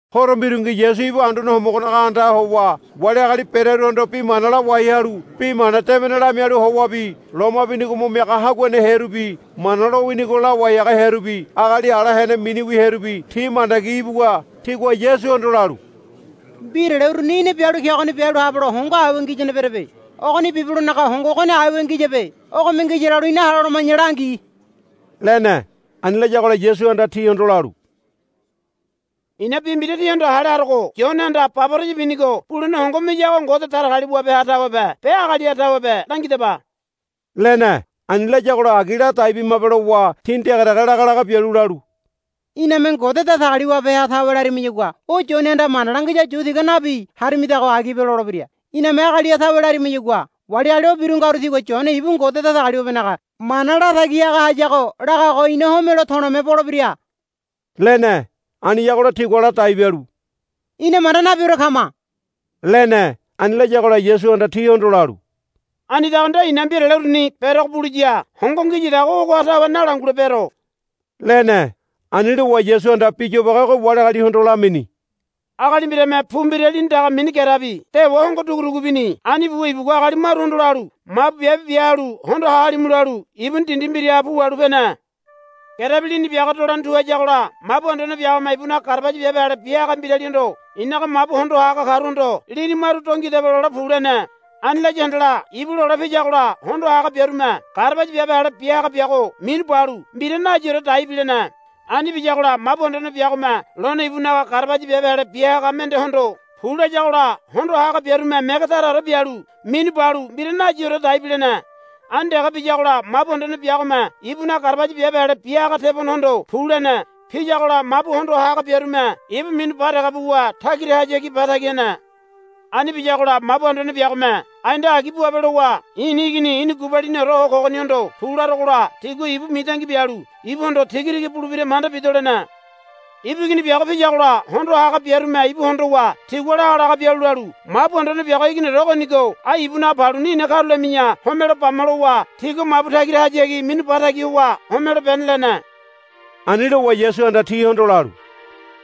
Horo mbirungi Yasu ibu Anduane Homogonaga andaha howa wali agali berearuhondo bi mana lawai halu Bi Mana Debene lamialu howabi loma binigo mo miaga haguane hearubi Mana lowinigo lawai haga hearubi agali ala hene miniwi hearubi ti mandagi ibuwa tigua Yasuhondo lalu, Mbirale uruni í̠na bialu kegoni bialu habelo hongo aiwa ngiyane berebe. Ogoni bibelonaga hongo ogoni aiwa ngiyabe. Ogome ngiya lalu ina hale holoma̱ya langi, lene. Ani layagola Yasuhanda tihondo lalu, I̱na bi mbira tíhondo hale harogo Yonehanda baboraya binigo bulene hongo miyago Ngode Datagaliwabeha tawebe be agaliha tawebe langidaba, lene. Ani layagola agi ladai bimabe lowa tini dege dege laga laga bialu lalu, Iname Ngode Datagaliwabeha tawe larimayagua o Yonehanda mana langiyago yu tiga nabi harimidago agibe lolebira. Iname agaliha tawe larimayagua wali agali o biru ngaru tigua Yone ibu Ngode Datagaliwabenaga mana latagi haga hayago lagago ina homelo to̱le̱me bolebira, lene. Aniyagola tigua ladai bialu, Ina manda nabiore kama, lene. Ani layagola Yasuhanda tihondo lalu, Anidago nde i̱na mbirale uruni berogo buliya hongo ngiyadago ogoha tawe nalangulebero, lene. Ani lowa Yasuhanda bi yobage ogo wali agalihondo lamini. Agali mbirame pu mbira lini daga mini gerebi dewa hongo dugu dugu bini. Ani buwa ibugua agali maruhondo lalu, Mabu biabe bia halu hondo ha halimu, lalu ibuni dindi mbiraha pu wahalu pene. Gerebi lini biago dolene tu hayagola mabu anduane biagome ibunaga garabaya biabe ale bia haga mbiralihondo, I̱naga mabu hondo ha haga karuhondo, Lini maru do ngidaba, lole pu, lene. Ani laya handala ibu lole piyagola hondo ha haga biarume garabaya biabe ale bia haga biago minu balu mbira nayiore dai bilene. Ani biyagola mabu anduane biagome lone ibunaga garabaya biabe ale bia haga mendehondo, Pu, layagola hondo ha biarume mege taraore bialu minu balu mbira nayiore dai bilene. Ani dege biyagola mabu anduane biagome ibunaga garabaya biabe ale bia haga tebonehondo, Pu, lene. Piyagola mabu hondo ha haga biarume ibu minu ba dege buwa tagirahayagi ba tagi hene. Ani biyagola mabu anduane biagome, Ai nde agi buabe, lowa, i̱ni igini i̱na gubaliniore ho kogonigohondo, Pu, larogola tigua ibu mitangi bialu ibuhondo tigatiga bulebira manda bido, lene. Ibu igini biago piyagola hondo ha haga biarume ibu hondowa tigua lagalaga bialu lalu, Mabu anduane biago iginiore ogonigo ai ibunaga paluni ina karulami̱ya homelo bama, lowa tigua mabu tagirahayagi minu ba tagi howa homelo bene, lene. Ani lowa Yasuhanda tihondo lalu,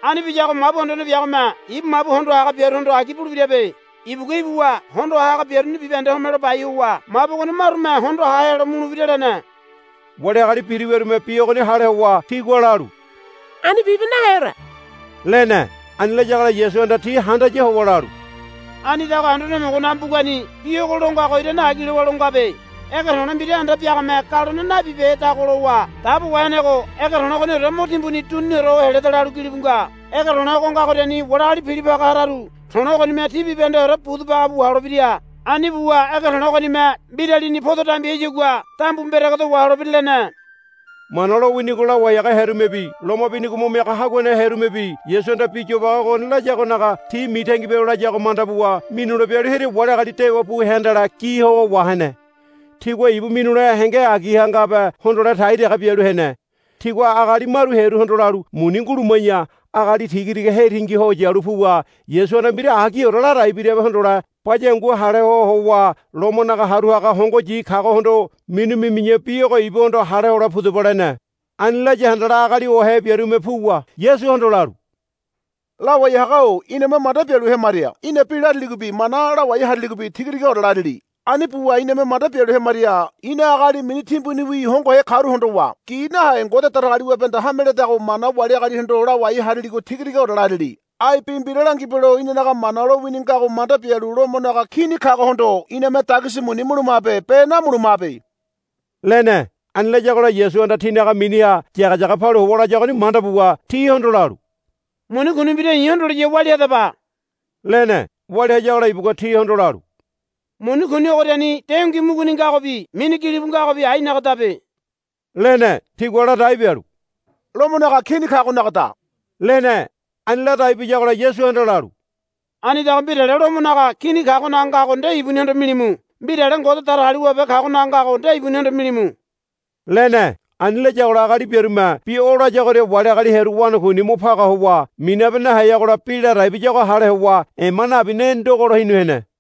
Ani biyago mabu anduane biagome ibu mabu hondo ha haga biaruhondo agi bulebirabe. Ibugua ibuwa hondo ha haga biaruni bibahende homelo bai howa mabu ogoni marume hondo ha helo mulebira, lene. Wali agali biru wiarume bi ogoni hale howa tigua lalu, Ani bibe naheore, lene. Ani layagola Yasuhanda ti handaya howa lalu, Anidago Anduane Homogonaga mbugani bi ogo lo ngago irane agi lowa lo ngabe. Ege to̱le̱ mbira anda biagame galone nabibehedago lowa dabo wahenego ege to̱le̱ ogoniore mo timbuni duniniore ho heleda, lalu gilibu nga. Ege to̱le̱ ogo ngagoriani wali agali pilo paga hararu to̱le̱ ogonime ti bibahendeore budu baga bu waholebira. Ani buwa ege to̱le̱ ogonime mbiralini podo dambi hayagua dambu mberegedo waholebira, lene. Mana lowinigo lawai haga hearumebi loma binigo mo miaga haguane hearumebi Yasuhanda bi yobage ogoni layagonaga ti mitangi bialu layago manda buwa minule bialu hearia wali agali dewa bu hea handala gi howa wahene. Tigua ibu minulene henge agiha ngabe hondole tai dege bialu hene. Tigua agali maru hearuhondo lalu, Muni nguluma̱ya agali tigatiga hetingi ho yalu puwa Yasuhanda mbira agiore ladai birabe hondole baya hangu hale ho howa Lomonaga haru haga hongoyi kagohondo minu mimi̱ya bi ogo ibuhondo hale hole pudaba, lene. Ani laya handala agali ohe biarume puwa Yasuhondo lalu, Lawai haga-o iname manda bialu hemaria í̠na bi lariligobi mana lawai hariligobi tigatigaore larili. Ani buwa iname manda bialu hemaria í̠na agali mini timbuniwi hongohe karu hondowa gi nahe Ngode Datagaliwabehanda hame ledago mana wali agalihondo lawai hariligo tigatigaore larili. Ai bi mbira langibelo inanaga Mana lowini ngago manda bialu Lomonaga Kini kagohondo iname dagisi muni mulumabe be namulumabe, lene. Ani layagola Yasuhanda tinaga miniha yageyage palu howa layagoni manda buwa tihondo lalu, Muni kuni mbira i̱ hondoliya walia hadaba, lene. Walia hayagola ibugua tihondo lalu, Muni kuni ogoriani dengui muguni ngagobi mini gili bu ngagobi ainagadabe, lene. Tigua ladai bialu, Lomonaga Kini kagonagada, lene. Ani ladai biyagola Yasuhanda lalu, Anidago mbirale Lomonaga Kini kagonaga ngago nde ibunihondo milimu. Mbirale Ngode Datagaliwabe kagonaga ngago nde ibunihondo milimu, lene. Ani layagola agali biarume bi o layagoria wali agali hearu wanakuini mo paga howa minabe naheyagola bi ladai biyago hale howa ema nabi ne ndogolo hinu hene.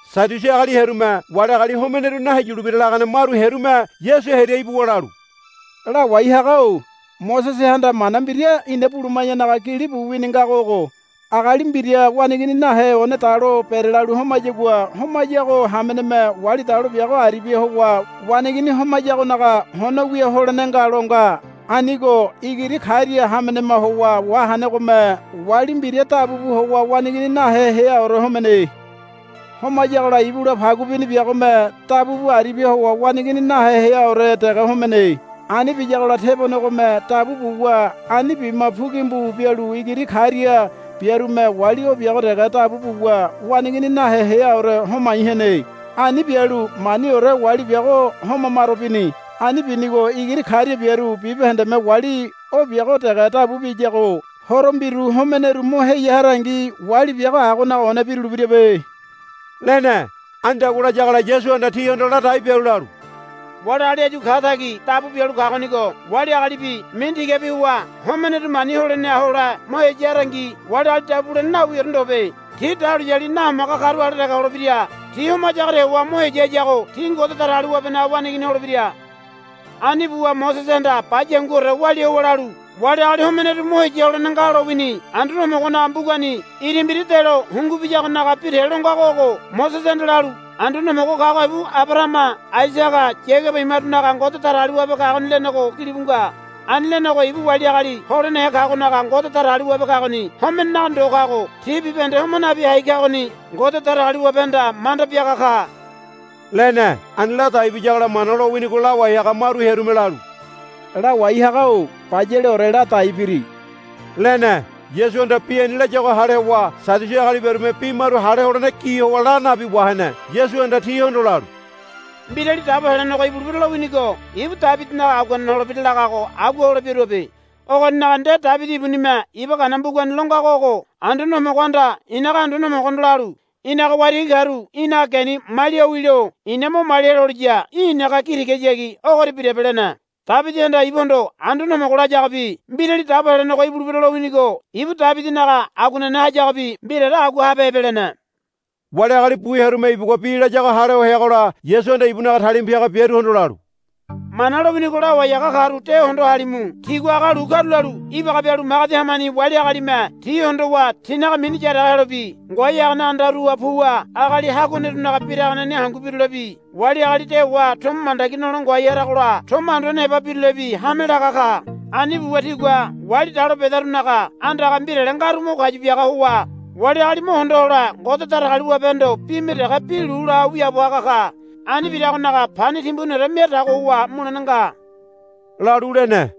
Sadiusi agali hearume wali agali homeneru naheyulebira lagane maru hearume Yasu hearia ibuwa lalu, Lawai haga-o Mosesehanda mana mbira ina buluma̱yanaga gili bu wini ngago ogo. Agali mbira waneigini nahe one dalo berelalu homayagua homayago hameneme wali dalo biago aribia howa waneigini homayagonaga hono wia holene nga, lo nga. Anigo igiri karia hamenema howa wahenegome wali mbira dabu bu howa waneigini nahe heaore homene. Homayagola ibula pagu bini biagome dabu bu aribia howa waneigini nahe heaore dege homene. Ani biyagola tebonegome dabu buwa ani bima pu gimbu bialu igiri karia biarume wali o biago dege dabu buwa waneigini nahe heaore homai hene. Ani bialu maniore wali biago homa maro bini. Ani binigo igiri karia biaru bibahendeme wali o biago dege dabu biyago horo mbiru homeneru mo heya harangi wali biago agonaga one birulebirabe, lene. Anidagua layagola Yasuhanda tihondo ladai bialu lalu, Wali agali áyu ka tagi dabu bialu kagonigo wali agalibi mini tigabi howa homeneru mani holeneha hole mo heya harangi wali agali dabu bulene nawiore ndobe. Ti dahuliyali nahomaga karu ale dege holebira. Ti homayagoria howa mo heya hayago ti Ngode Datagaliwabenaga waneigini holebira. Ani buwa Mosesehanda baya hanguore walia howa lalu, Wali agali homeneru mo heya holene nga, lowini. Anduane Homogonaga mbugani ira mbira delo hungu biyagonaga bi te lo ngago Mosesehanda lalu, Anduane Homogo kago ibu Abarahama Aisaga Yagaba imarunaga Ngode Datagaliwabe kagoni, lenego gilibu nga. Ani lenego ibu wali agali holenehe kagonaga Ngode Datagaliwabe kagoni homenenaga ndo kago ti bibahende homa nabi hai kagoni Ngode Datagaliwabehanda manda biaga ka, lene. Ani ladai biyagola Mana lowinigo lawai haga maru hearume lalu, Lawai haga-o bayaleore ladai biri, lene. Yasuhanda bi ani layago hale howa Sadiusi agali biarume bi maru hale holene gi howa la nabi wahene. Yasuhanda tihondo lalu, Mbirali Dabo Helenego ibulebira lowinigo ibu Debidinaga aguanene holebira lagago agua hole biaruabe. Ogoninaga nde Debidi ibunime Iba Gana mbugani lo ngago ogo, Anduane Homogohanda i̱naga Anduane Homogohondo lalu, Í̠naga waitigi karu í̠naga geni malia ho wilo i̱na mo malia heloliya í̠ i̱naga gi tigahayagi ogoria birabe, lene. Debidihanda ibuhondo Anduane Homogo layagobi Mbirali Dabo Helenego ibulebira lowinigo ibu Debidinaga aguanene hayagobi mbiraore agua habehebe, lene. Wali agali bu hearume ibugua bi layago hale ho heagola Yasuhanda ibunaga talima piaga biaruhondo lalu, Mana lowinigo lawai haga karu de hondo halimu. Tigua aga lu karulalu ibaga bialu magedi hamani wali agalime ti hondowa tinaga mini yaraga helobi ngoai hagane andaruha puwa agali haguanerunaga biraganeni hangu birulebi wali agali dewa tomo mandagi nole ngoai haragola tomo anduane heba birulebi hame laga ka. Ani buwa tigua wali dalo bedarunaga andaga mbirale ngaru mo kayu biaga howa wali agali mo hondo hole Ngode Datagaliwabehondo bime dege bi lu la ho wiaabo haga ka. Ani biragonaga pani timbuniore mia tago howa mulene nga, lalu lene.